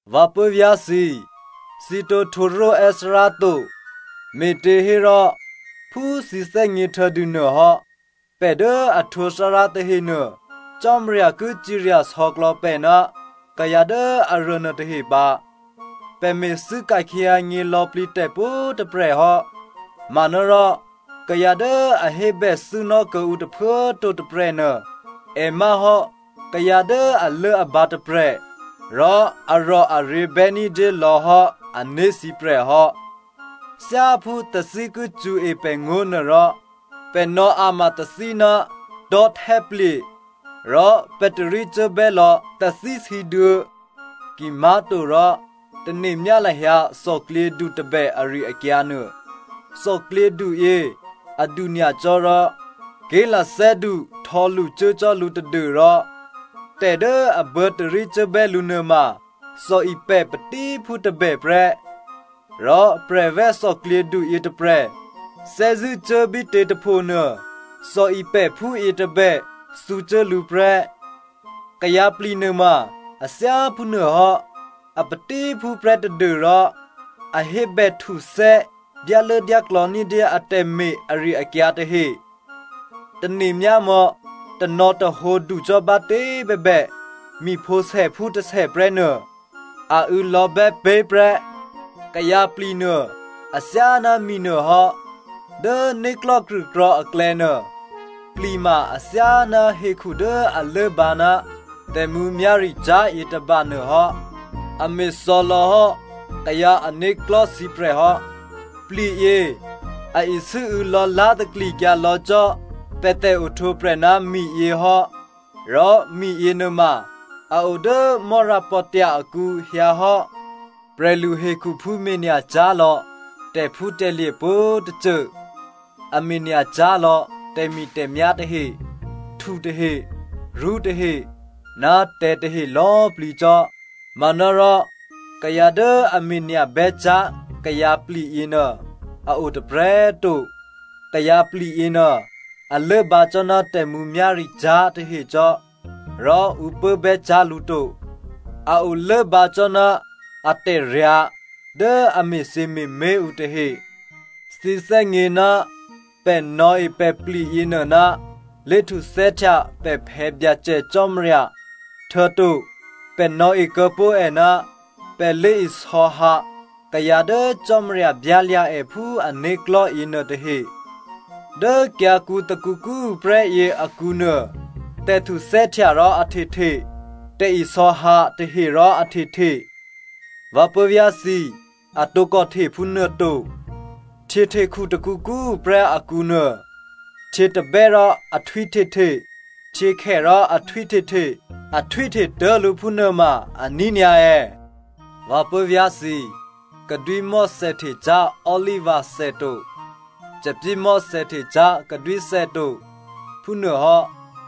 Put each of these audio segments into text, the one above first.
Vǎ puố̤vyá̤ thǐ꤮, thǐ tǒ htwǒ ró̤è́ Thárá to, me̤těhérò phú thǐ thè́gně htuô̌dûnuô hò́, pè̤ dố a htwǒ Thárá tahenuô, Cò́marya ki cirya sò̌klò̌ pè̤ ná kayǎ dố aruô nuôtahe pǎ. Pè̤ me̤thû́ ka̤khyěhyǎnyě lò̌plǐ tè̤ pwǒ̤꤮ tôprè̤ hò́. Manárò kayǎ dố a hébèthû́nò́ kuô̌ǔ tôphuố꤮ to tôprè̤nuô, è má̤ hò́ kayǎ dố alốabǎ tôprè̤ rò arò̤aryě̤bè́ ní̤dyé lò̌hò́ a né̤sǐprè̤ hò́. Thyáphú tathí ki cṳ̌e pè̤ngó̤nuô rò, pè̤ nò̌ a̤ma tathí ná tò̤́htè́plye̤, rò pè̤ tarícuốbè́ lò̌ tathísǐduô̌. Kimá̤torò tane̤myá lahyǎ thòklyědu tôbè ari-akyǎ nuô. Thòklyědu yě adu nyacò́ rò ké̤lathè́du htò̌lṳcuố cò́ lǔ tadû́rò tè̤ dố a buô̌ tarícuốbè́ lǔ nuôma thòipè̤ patíphú tôbè prè́. Rò prè̤vè̤́ thòklyědu yětôprè̤ thè́zṳ̂́ cuốbítě tôphonuô, thòipè̤phú yětôbè thǔcuố lǔ prè́. Kayǎpli̤ nuôma a thyáphú nuôhò́. A patíphú prè́ tadû́rò a hébèhtuthè́ dyálốdyáklò̌ ní̤dyé atè̤me̤ ari-akyǎ tahe. Tane̤myámò̌, tanò̌tahǒ ducò́ bátě꤮ bèbè, mi̤phǒsèphú tôsè prè́nuô a û̌lò̌bè́ pé̤ prè́. Kayǎ pli̤nuô athyáná mi nuôhò́. Dố né̤klò̤́ krṳ̂krò̤̌ aklè̌nuô, pli̤ ma athyáná hekhu dố a lốbǎ ná tè̤mǔmyá̤ricyá̤ yětôba nuôhò́. A me̤thò̌ lò̌hò́ kayǎ ané̤klò̤́ sǐprè̤ hò́. Pli̤yě a isû́û̌ lò̌lá̤ taklikyǎ lò̌ cò́ pè̤ tè̤ohtwǒprè̤ ná miyě hò́ rò mi yěnuôma a o dố mò́rapò̤tya̤ akǔ hyǎ hò́. Prè̤lu hekhuphú me̤nya̤cyá̤ lò̌ tè̤phútè̤lye̤ pwǒ̤tôcô, a me̤nya̤cyá̤ lò̌ tè̤mi̤tè̤myá̤ tahe, htu tahe, rṳ́ tahe ná tè̤̌ tahe lò̌꤮ plǐ cò́. Manárò kayǎ dố a me̤nya̤ bè́cyá̤ kayǎpli̤ yěnuô a o tôprè̤꤮ to. Kayǎpli̤ yěnuô a lốbǎ cò́ ná tè̤mǔmyá̤ricyá̤ tahe cò́ rò ǔ pốbè́cyá̤ lǔ to, a o lốbǎ cò́ ná atè̤ryǎ̤ dố a me̤thyěme̤mé̤ ǔ tahe. Thǐ thè́gně ná pè̤ nò̌e pè̤pli̤ yěnuô ná lé̤htuthè́htya pè̤ Phè̌ Byacè Cò́marya, htuô̌to pè̤ nò̌e kuô̌ pó̤ è ná pè̤ lé̤isò̌hǎ kayǎ dố Cò́marya byálya̤ è phú ané̤klò̤́ yěnuôtahe. Dố kyǎ̤kǔ tôkǔkǔ꤮ tuô̌prè́ yěakǔnuô tè̤htuthè́htya rò a htehte, tè̤isò̌hǎ tahe rò a htehte. Vǎ puố̤vyá̤ thǐ꤮, a tǒkò hte phúnuô to. Htyěhtekhu tôkǔkǔ꤮ tuô̌prè́ akǔ nuô, htyětabè́ rò a htwíhtehte, htyěkhè rò a htwíhtehte, a htwíhte tố̤lǔ phúnuôma aní̤ nyǎ è̌? Vǎ puố̤vyá̤ thǐ꤮, kadwímò̤́ thèhtecyá̤ olivathè to. Thòbǐthèmò̤́ thè́htecyá̤ kadwíthè to, phúnuôhò́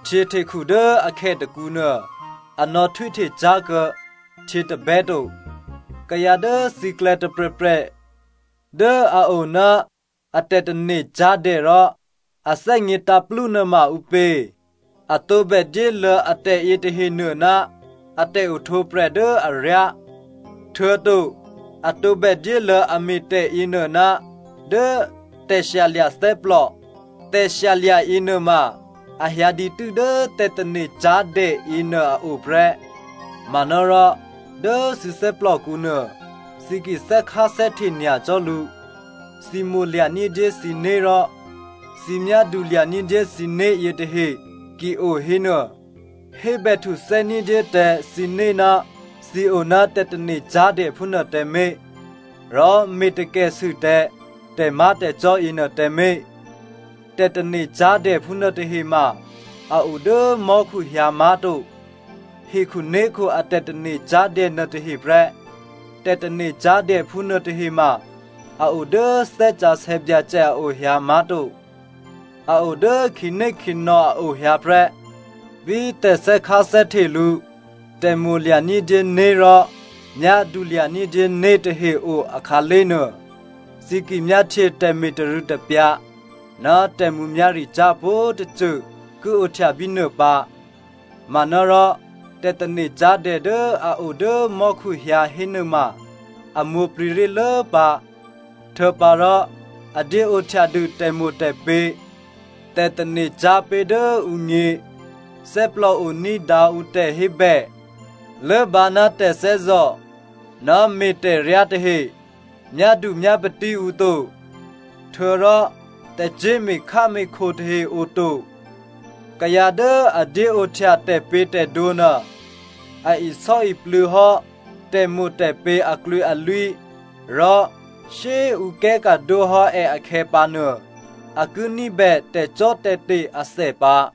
htyěhtekhu dố akhè tôkǔnuô, a nò̌htwíhte cyá̤kuô̌ htyětabè́ to. Kayǎ dố thǐklè̌ tôprè̤prè̤ dố a o ná a tè̤tane̤ cyá̤dè rò a thè́gně tǎ̤plú nuôma ǔpě? A tǒbè dyéluô̌ atè̤ yětahenuô ná a tè̤ohtwǒprè̤ dố aryá, htuô̌to a tǒbè dyéluô̌ a me̤tè̤ yěnuô ná dố tè̤shyalya̤ thè́plò. Tè̤shyalya̤ yěnuôma a hyǎ dǐtû́ dố tè̤tane̤cyá̤dè yěnuô a o prè́. Manárò dố thǐ thè́plòkǔnuô, thǐ ki thè́kháthè́hte nyacò́ lǔ, thǐ mo̤lya̤ ní̤dyé thǐné̤ rò thǐ myádulya̤ ní̤dyé thǐné̤ yětahe ki o hénuô, hébè htuthè́ ní̤dyé tǎ thǐné̤ ná thǐ o ná tè̤tane̤cyá̤dè phúnuô tǎmé̤, rò me̤takèsû tǎ tè̤má̤tè̤cò́ yěnuô tǎmé̤. Tè̤tane̤cyá̤dè phúnuôtahe ma a o dố mò́khu hyǎ má̤to, hekhuné̤khu a tè̤tane̤ cyá̤dè nuôtaheprè́. Tè̤tane̤cyá̤dè phúnuôtahe ma a o dố Thè́ Sǎsè̌ Byacè a o hyǎ má̤to, a o dố khǐnékhǐnò̌ a o hyǎ prè́. Bí tè̤thè́kháthè́hte lǔ, tè̤mo̤lya̤ ní̤dyé né̤ rò myádulya̤ ní̤dyé né̤ tahe o akhǎlé̤ nuô, thǐ ki myáhtye tè̤me̤tarû̌tapyǎ ná tè̤mǔmyá̤ricyá̤ pwǒ̤꤮ tôcô ki ohtya bínuô pǎ. Manárò tè̤tane̤cyá̤dè dố a o dố mò́khu hyǎ hénuôma a mwǒ̤plǐ ré̤lố pǎ, htuô̌pǎrò a dyé ohtyadû tè̤mo̤tè̤pě̤, tè̤tane̤ cyá̤pé̤ dố ǔgně, thè́plòo ní̤dǎ ǔ tè̤hébè, lốbǎ ná tè̤thè́zò̤ ná me̤tè̤ryá tahe, myádu myápatí ǔ to, htuô̌rò tè̤cyé̤ me̤kháme̤kho tahe o to. Kayǎ dố a dyéohtya tè̤pě̤tè̤dwǒ nuô, a isò́iplû̌ hò́ tè̤mo̤tè̤pě̤ aklwǐalwí rò shyé꤮ ǔ kè́ka̤dwóhò́ è akhè̌pǎnuô, a ki ní̤bè tè̤cò́tè̤te̤ athè pǎ.